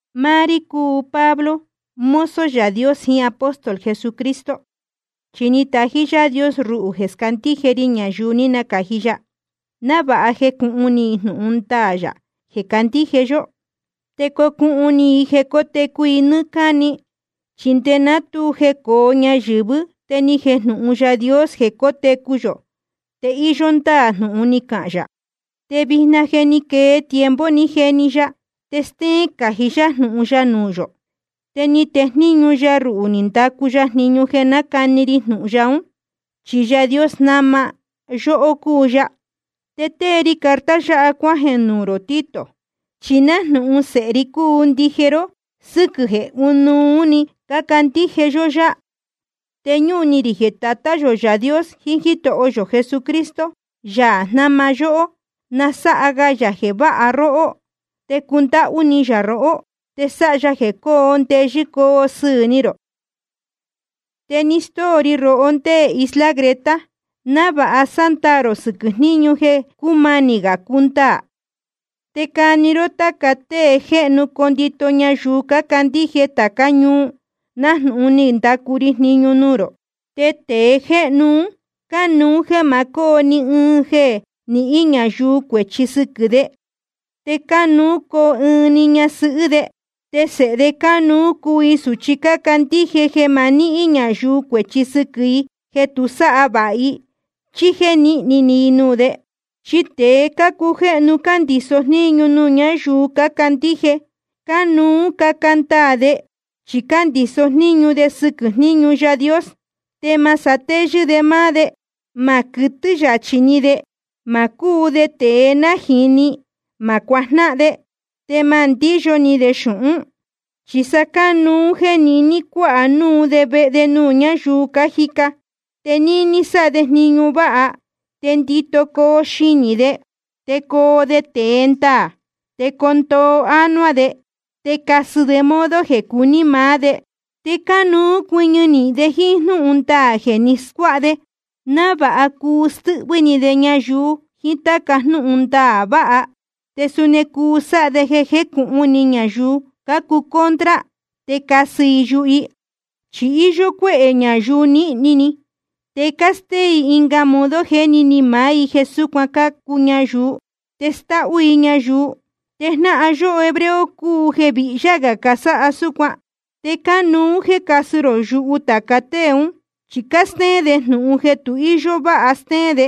Máá rí cúu Pablo, mozo Yaā Dios jiín apóstol Jesucristo, chi ni tají Yaā Dios ruhū jeē scándíje ri ñayuu ní nacāji ya, návāha jecūhun ni i jnūhun ndaā yā jeē candíje yó, te cocuhun ni i jeē cótecu i nɨ́ɨ́ cáni. Chi nde ná tu jecōo ñayɨ̄vɨ́ te ni jejnūhun Yaā Dios jeē cótecu yō, te íyó ndáā jnūhun ni cahān yā. Te vijna jeē ní quee tiempo ni jeni ya, te stéén cají yá jnūhun ya nuū yō. Te ni tejníñu ya ruhū ni ndacu ya jniñu jeē nácani ri jnūhun ya ún. Chi Yaā jnáma yóhó cúu ya. Te tée ri carta yáha cuájeē nuū rō Tito, chi nájnūhun sēhe ri cúu ndije ró sɨ́quɨ̄ jeē ɨ́nuú‑ni cándíje yó yá. Te ñúhun ni rī jeē Tatá yō Yaā Dios jiín Jítoho yō Jesucristo, Yaā jnáma yóhó, na sáha ga yā jeē váha róhó, te cundáhú ni yā rohó, te sáha ya jeē coo ndeyɨ́ coo sɨɨ̄ ni rō. Te ni stóo ri rohó ndé isla Creta, návāha sándaā rō sɨquɨ̄ jníñu jeē cúmanī gā cundaā, te cani ró táca tée jéhnu condito ñayuu cácandíje tācá ñuu, nájnūhun ni ndacu ri jniñu nuū rō. Te tēe jéhnu un cánuú jeē ma cóo ni ɨɨn jeē nihín ñayuu cuēchi sɨquɨ̄ de. Te cánuú coo ɨɨn‑ni ñasɨhɨ́ de. Te sēhe de cánuú cuu i sūchi cácandíje jeē ma nihín ñayuu cuēchi sɨquɨ̄ i jeē tu sáha vāha i chí jéē níhni ni i nuū de. Chi tēe cácujéhnu cándiso jníñu nuū ñáyuu cácandíje, cánuú caca ndaā de chi cándiso jníñu de sɨquɨ̄ jníñu Yaā Dios. Te ma satéyɨ́ de máá de, ma quɨtɨ́ yachī ni de, ma cúu de tēe nájīni, ma cuajnáhan de, te ma ndíyo ni de xūhún. Chi sa cánuú jéē niní cuāha núu de vehe nuū ñáyuu cájica, te níní sáha de jniñu váha, te ndito coo xinī de, te coo de tēe ndaā, te coo ndoo ánuá de, te casɨ de modo jeē cuní maá de. Te cánuú cuɨñɨ nīhin de jíín jnúhun ndaā jeē ni scuáha de, návāha cuu stɨ́hvɨ́ ni de ñayuu jiín táca jnúhun ndaā vāha, te suni cuu sáha de jeē jécūhun ni ñayuu cácuu contra, te casɨ i yuhu i. Chi íyó cuéhē ñayuu nīhni ni, te cástéén i ɨnga modo jéni ni maá i jeē súcuan cācu ñayuu, te stáhú i ñayuu. Te jnáhan yó hebreo cúu jeē vihyá gā casáha súcuan. Te cánuú jéē casɨ rō yuhu tāca tée ún, chi cástéén de jnūhun jeē tu íyó váha stéén de,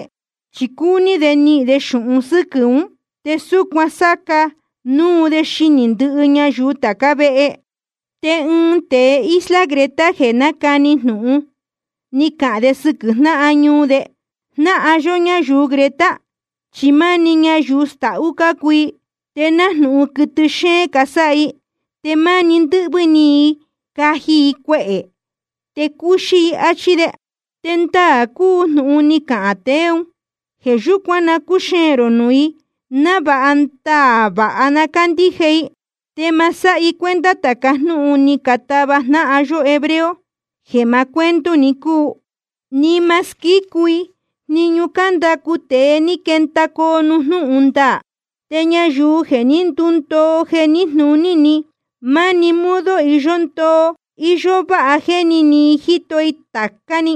chi cúní de nihīn de xūhun sɨ́quɨ̄ ún. Te súcuan sáca nuu de xinī ndɨhɨ ñayuu tācá vehe. Te ɨɨn tēe isla Creta jeē nácani jnūhun, ni cahān de sɨquɨ̄ jnáhan ñuu de: Jnáhan yó ñayuu Creta, chi máni ñayuu stahú cácuu i, te nájnūhun quɨtɨ xéén casáha i, te máni ndɨ́hvɨ́ ni i caji cuehē i, te cúxí i, áchí de. Te ndaā cúu jnūhun ni cahān tēe ún. Jeē yúcuan na cúxeēn rō nuū i, návāha ndaā vāha na cándíje i. Te ma sáha i cuenta tāca jnúhun ni catava jnáhan yó hebreo, jeē maá cuento‑ni cúu, ni ma squícu i jniñu cándacu tēe ni quendacoo nuū jnúhun ndaā. Te ñayuu jeē ní ndundoo jeē níjnūní, máni modo iyó ndoo íyó váha jéni ni i jíto i tācá‑ni.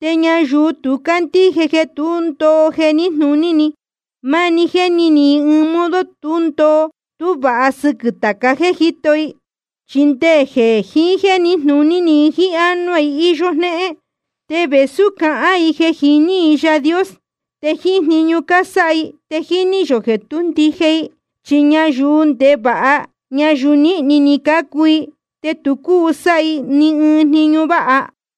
Te ñayuu tu cándíje jeē tu ní ndúndoo jeē níjnūní, máni jéni ni i ɨɨn modo tú ndoo tú vāha sɨquɨ̄ tāca jéē jíto i. Chi nde jeē níjnūní i jíín ánuá i íyó jnéhén. Te vēsú cácahān i jeē jiní i Yaā Dios, te jíín jniñu cásáha i te jíní yō jeē tú ndije i. Chi ñayuu ndevāha ñayuu nīhni ni cácuu i, te tu cúu sáha i ni ɨɨn jniñu váha.